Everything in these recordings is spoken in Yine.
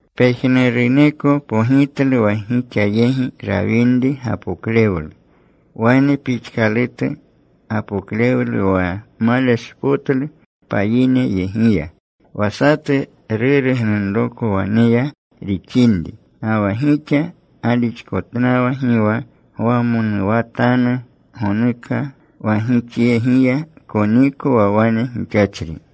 Pejnuruneko pogitlu wa gixa yegi rawinri gapoklewlu, wane pixkalutu gapoklewlu wa maleshpotlu payineyegiya. Wa satu ruru gnunroko waneya rixinri. Ga wa gixa galixkotnawa. Gi wa gwamonuwatanu gonuka wa gixyegiya koniko wa wane gixachri.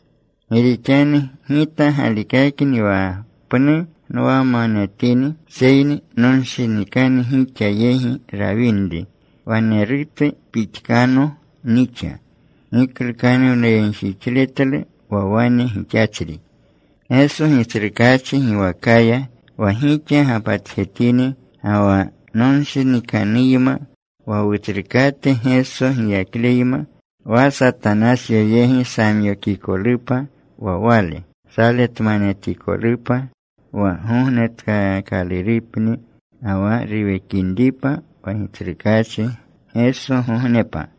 Gi rixanu gita galikakni wa pnu nwamanetini, seyni nonshinikanu gixa yegi rawinri, wanerutu pixkano nixa giklukanuwnayegjixletlu wa wane gixachri. Geso Gitsrukaachi giwakaya, wa gixa gapatjetini ga wa nonshinikanuyma, wa Wutsrukate Geso giyakleyma. Wa Satanasyo yegi samyokikolupa wa wale, saletmanetikolupa, wa gognetkaakalurupni ga wa ruwekinripa wa Gitsrukaachi Gesogognepa.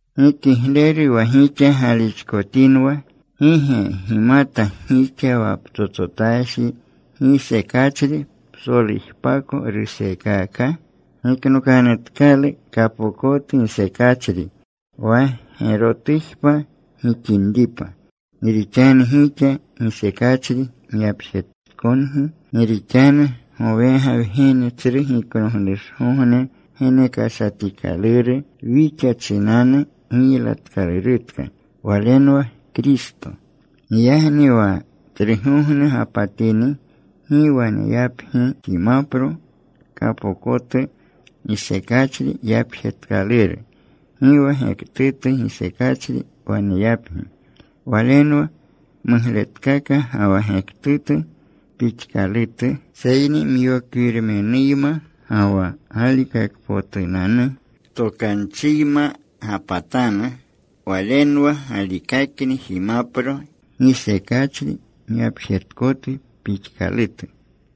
Gi kigleru wa gixa galixkotinwa. ¿Gi ge gimata gixa wa ptsotsotaji gisekachri psolujpako ruseekaka? Giknokanutkalu kapokotu gisekachri, wa gerotujpa gixinripa. Gi rixanu gixa gisekachri myapjetkangi. Gi rixanu gowega wgene Tsru Giknoglushgogne genekashatikaluru. Wixa chinanu giylatkalurutka. Walenwa Kristo. Giyagni wa Tsrugogne gapatini, gi waneyapgi jimapro kapokotu gisekachri yapjetkaluru. Gi wa gektutu gisekachri waneyapgi. Walenwa mugletkaka ga wa gektutu pixkalutu. Seyni myokwirmenuyma ga wa galikakpotunanu tokanchiyma gapatanu. Walenwa galikakni jimapro gisekachri myapjetkotu pixkalutu.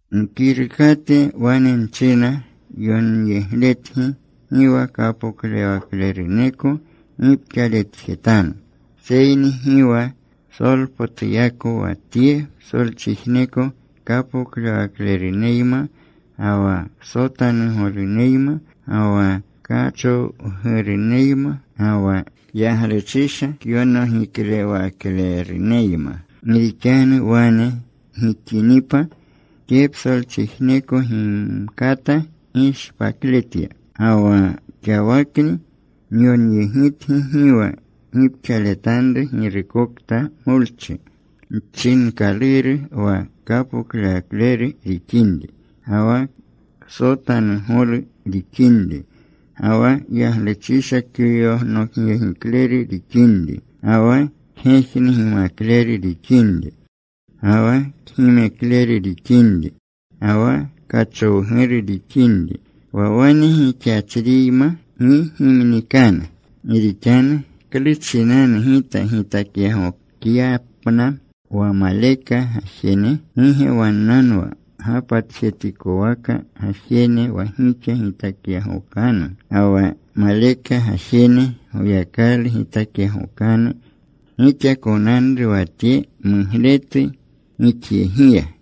Nkirukate wane nchina yonyegletgi gi wa kapoklewakleruneko gipxaletjetanu. Seyni gi wa psolpotuyako wa tye psolchijneko kapoklewakleruneyma, ga wa ksotanugoluneyma, ga wa kachowguruneyma, ga wa yagluchisha kyonogiklewakleruneyma. Gi rixanu wane gixinipa, tye psolchijneko gimkata gishpakletya. Ga wa xawakni nyonyegitgi gi wa gipxaletanru girukokta molchi chinkaluru wa kapoklewakleru rixinri, ga wa ksotanugolu rixinri, ga wa yagluchisha kyonogyegikleru rixinri, ga wa kgejnugimakleru rixinri, ga wa kgimekleru rixinri, ga wa kachowguru rixinri. Wa wane gixachriyma gi gimnikanu. Gi rixanu ¿klu chinanu gita gitakyagokyapna wa maleka gajene? ¿Gi ge wannanwa gapatjetikowaka gajene wa gixa gitakyagokanu? Ga wa maleka gajene Goyakalu gitakyagokanu. Gixa konanru wa tye mugletu gixyegiya.